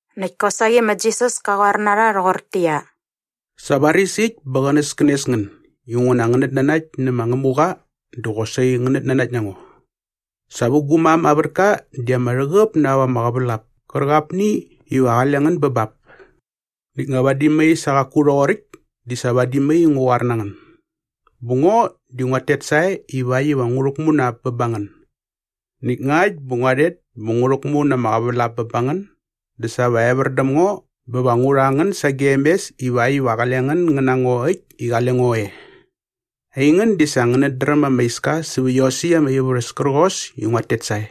Näkt kosaqi ma Jisas ka qoar na rha rhoqortäqyia, “Sa varis äkt bä qänäskänes ngän inguna ngänät nanakt nä ma Ngämuqa dä qosaqi ngänät nanakt na ngo. Sa vä gu mam aa vätka di ama rhäqäp na ap ama qävälap kärqapni iva qale ngän bä bap. Näkt nga vadi mai sa qaku rhoqoräkt di sa vadi mai ngua qoar na ngän. Bä ngo di nguat tet sae ivakt iva ngu rhäkmu na ap bä ba ngän. Näkt ngakt bä ngua rhet bä ngu rhäkmu na ama qävälap bä ba ngän dä sa va evär däm ngo bä va ngu rha ngän sagem mes ivakt iva qale ngän ngän na ngo äkt i qale ngo e. Aingän di sa ngänät dräm ama iska sävä iosäkt ama ivärhäs kärqos i nguat tet sae.”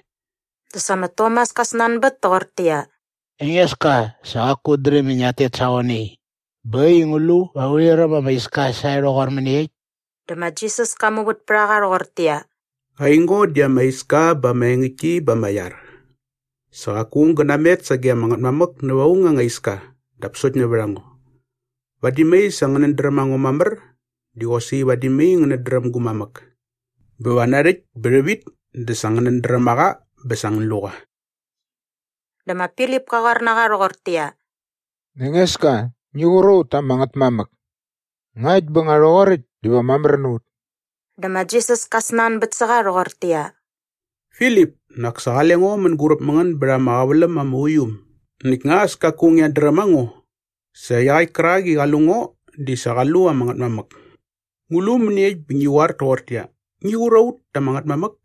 Dä sa ma Tomas ka snanbät toqortäqyia, “Engeska, sa qaku ut dräm i ngiat tet sa qoe nai bä äkt i ngu lu va urhi räm ama iska sae rhoqor mäniekt?” Dä ma Jisas ka muvät pät a qa rhoqortäqyia, “Aingo di ama iska bä ama engäktki bä ama iar. Sa qaku aung gä namet sage ama Ngätmamäk näva aung anga iska dap sokt nävät a ngo. Vadi mai sa ngänät dräm a ngo mamär di qosaqi vadi mai ngänät dräm gu mamäk. Bä va narhäkt bä rhävit dä sa ngänät dräm a qa bä sa ngän lu qa.” Dä ma Filip ka qoar na qa rhoqortäqyia, “Engeska, ngi qur a ut ta ama Ngätmamäk. Ngakt bä nga rhoqoräkt diva mamär na ut.” Dä ma Jisas ka snanbät sä qa rhoqortäqyia, “Filip, nak sa qale ngo mänguräp mä ngän bät ama qäväläm ama uiu äm näkt nga as kaku ngiat dräm a ngo? Sa iaqäkt kärak i qa lu ngo di sa qa lu ama Ngätmamäk. Ngu lu mäniekt bä ngi qoar toqortäqyia, ‘Ngi qur a ut ta ama Ngätmamäk’?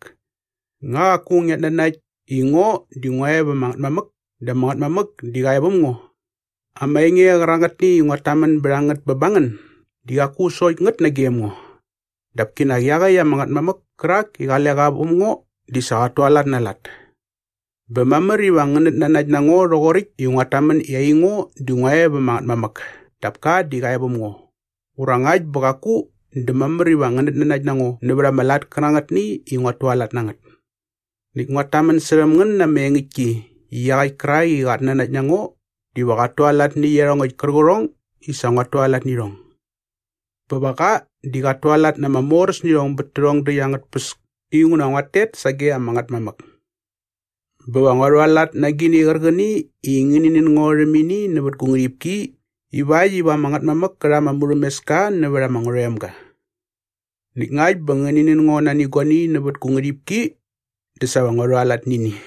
Nga qaku ngiat nanakt i ngo di ngua e va ama Ngätmamäk dä ama Ngätmamäk di qa e väm ngo? Ama enge kärangätni i nguat tamän bät a ngät bä ba ngän di qaku sokt ngät nagem ngo. Dap kinak iaqäkt ama Ngätmamäk kärak i qale qa väm ngo di sa qat tualat na aa lat. “Bä mamär iva ngänät nanakt na ngo rhoqoräkt i nguat tamän i aingo di ngua e va ama Ngätmamäk dap ka di qa e väm ngo ura ngakt bä qaku dä mamär iva ngänät nanakt na ngo nävät ama lat kärangätni i nguat tualat na ngät. Näkt nguat tamän särhäm ngän na ama engäktki i iaqäkt kärak i qat nanakt na ngo diva qat tualat nä iarhongäkt kärqärhong i sa nguat tualat nä irhong. Bä va qa di qat tualat na ama moräsnirhong bät tärhong däkt angät tpäs inguna nguat tet sage ama Ngätmamäk. Bä va ngua rhualat na agini qärqäni i ngäni nän ngo rhäm ini nävät gu ngärhipki ivakt iva ama Ngätmamäk kä rha ama murhämeska nävät ama Ngärhoemga. Näkt ngakt bä ngäni nän ngo nani guani nävät gu ngärhipki dä sa va ngua rhualat nä ini.”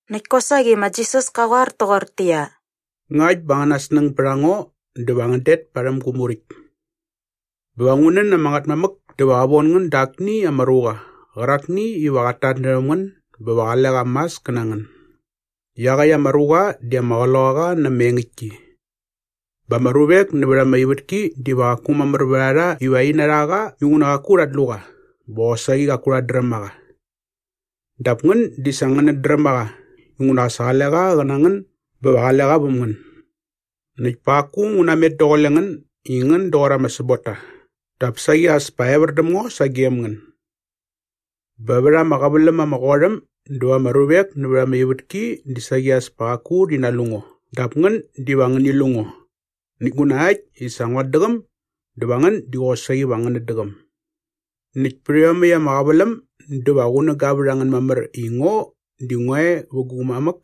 Näkt kosaqi ma Jisas ka qoar toqortäqyia, “Ngakt bä angäna snäng bät a ngo dä va ngän det parhäm gu muräkt. Bä va ngu nän ama Ngätmamäk dä va qä von ngän da akni ama ruqa qärakni iva qat tatnärhäm ngän bä va qale qa mas kä na ngän. Iaqäkt ama ruqa di ama Qloqaqa na ama engäktki. Bä ama ruvek nävät ama ivätki diva qaku mamär vät a rha iva rhi narha qa inguna qaku rhat lu qa bä qosaqi qaku rhat dräm a qa. Dap ngän di sa ngänät dräm a qa inguna sa qale qa qä na ngän bä va qale qa väm ngän. “Näkt pa qaku ngu namet daqule ngän i ngän doqor ama säbotta dap saqi as pa evär däm ngo sagem ngän. Bä vät ama qäväläm ama qot äm dä va ama ruvek nävät ama ivätki di saqi as pa qaku rhi nalu ngo dap ngän diva ngäni lu ngo. Näkt nguna äkt i sa nguat däqäm dä va ngän di qosaqi va ngänät däqäm. Näkt pät iomäkt ama qäväläm dä va qunäga vät a ngän mamär i ngo di ngua e vä gu mamäk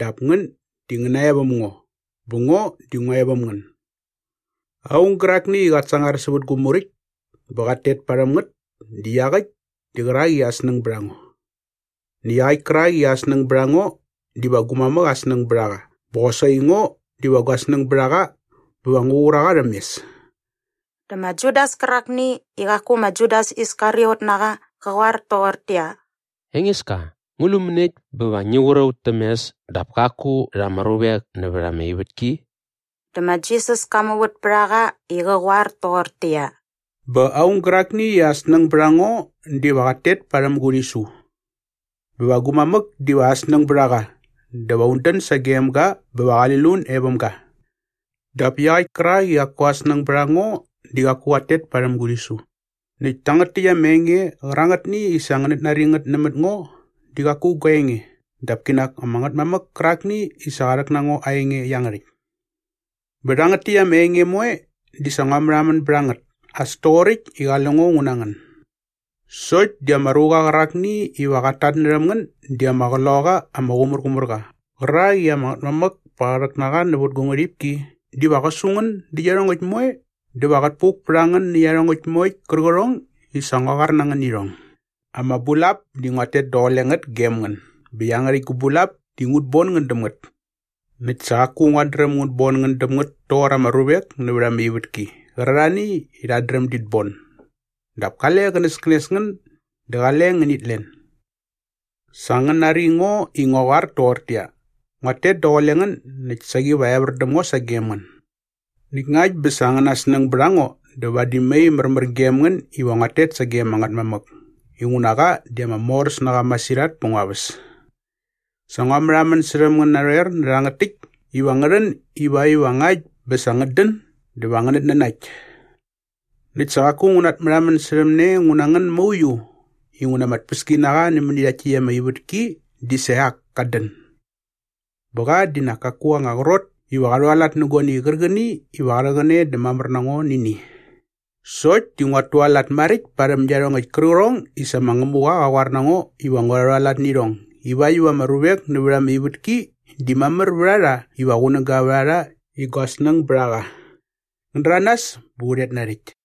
dap ngän di ngän nae väm ngo bä ngo di ngua e väm ngän. Aung gärakni i qat sangar sävät gu muräkt bä qat tet parhäm ngät di iaqäkt di qärak i aa snäng bät a ngo. Näkt iaqäkt kärak i aa snäng bät a ngo diva gu mamäk aa snäng bät a qa bä qosaqi ngo diva gua snäng bät a qa bä va ngu qur a qa rhäm mes.” Dä ma Judas kärakni i qaku ma Judas Iskariot na qa qa qoar toqortäqyia, “Engeska, ngu lu mäniekt bä va ngi qur a ut täm mes dap kaku rha ama ruvek nävät ama ivätki?” Dä ma Jisas ka muvät pät a qa i qä qoar toqortäqyia, “Bä aung gärakni i aa snäng bät a ngo diva qat tet parhäm gu rhisu. Bä va gu mamäk diva aa snäng bät a qa dä va un dän sagem ga bä va qali lun e väm ga. Dap iaqäkt kärak i qaku aa snäng bät a ngo diva qaku qat tet parhäm gu rhisu. Näkt tangät täkt ama enge qärangätni i sa ngänät nari ngät nämät ngo di qaku gua enge dap kinak ama Ngätmamäk kärakni i sa qa rhäk na ngo aa enge iangärhäkt. “Bä rhangät täkt ama enge moe di sa ngua märhamän bät a ngät as toqoräkt i qale ngo ngu na ngän. Sokt di ama ruqa qärakni iva qat tatnärhäm ngän di ama Qloqaqa ama Qumärqumärqa qärak i ama Ngätmamäk pa qä rhäk na qa nävät gu ngärhipki diva qä su ngän dä iarhongäkt moe dä va qät puk pät a ngän nä iarhongäkt moekt kärqärhong i sa ngua qoar na ngän nä irhong. “Ama bulap di nguat tet daqule ngät gem ngän bä iangärhäkt gu bulap di ngut bon ngän däm ngät. Näkt sa qaku nguat dräm ngut bon ngän däm ngät toqor ama ruvek nävät ama ivätki qärarhani i rhat dräm dit bon. Dap kale qänäskänes ngän dä qale ngänit len. “Sa ngän nari ngo i ngua qoar toqortäqyia, ‘Nguat tet daqule ngän näkt saqi va evär däm ngo sagem ngän.’ Näkt ngakt bä sa angäna snäng bät a ngo dä vadi mai märmär gem ngän iva nguat tet sage ama Ngätmamäk inguna qa di ama moräs na qa masirhat pä ngua väs. “Sa ngua märhamän särhäm ngän narhoer nä rhangät täkt iva ngä rhän ivakt iva ngakt bä sa ngät dän dä va ngänät nanakt. Näkt sa qaku ngu natmärhamän särhäm ne ngu na ngän mauiu inguna ama tpäskinaqa nämäni rhakt täkt ama ivätki di sa iak kat dän. Bä qa di nak kaku aa anga qrot iva qa rhualat nä guani qärqäni iva qa rhäqäne dä mamär na ngo nä ini. Sokt di nguat tualat maräkt parhäm iarhongäkt kärqärhong i sa ma Ngämuqa qa qoar na ngo iva ngua rhualat nä irhong ivakt iva ama ruvek nävät ama ivätki di mamär vät a rha iva qunäga vät a rha i gua snäng bät a qa. “Ngän däranas bä u rhet narhäkt.”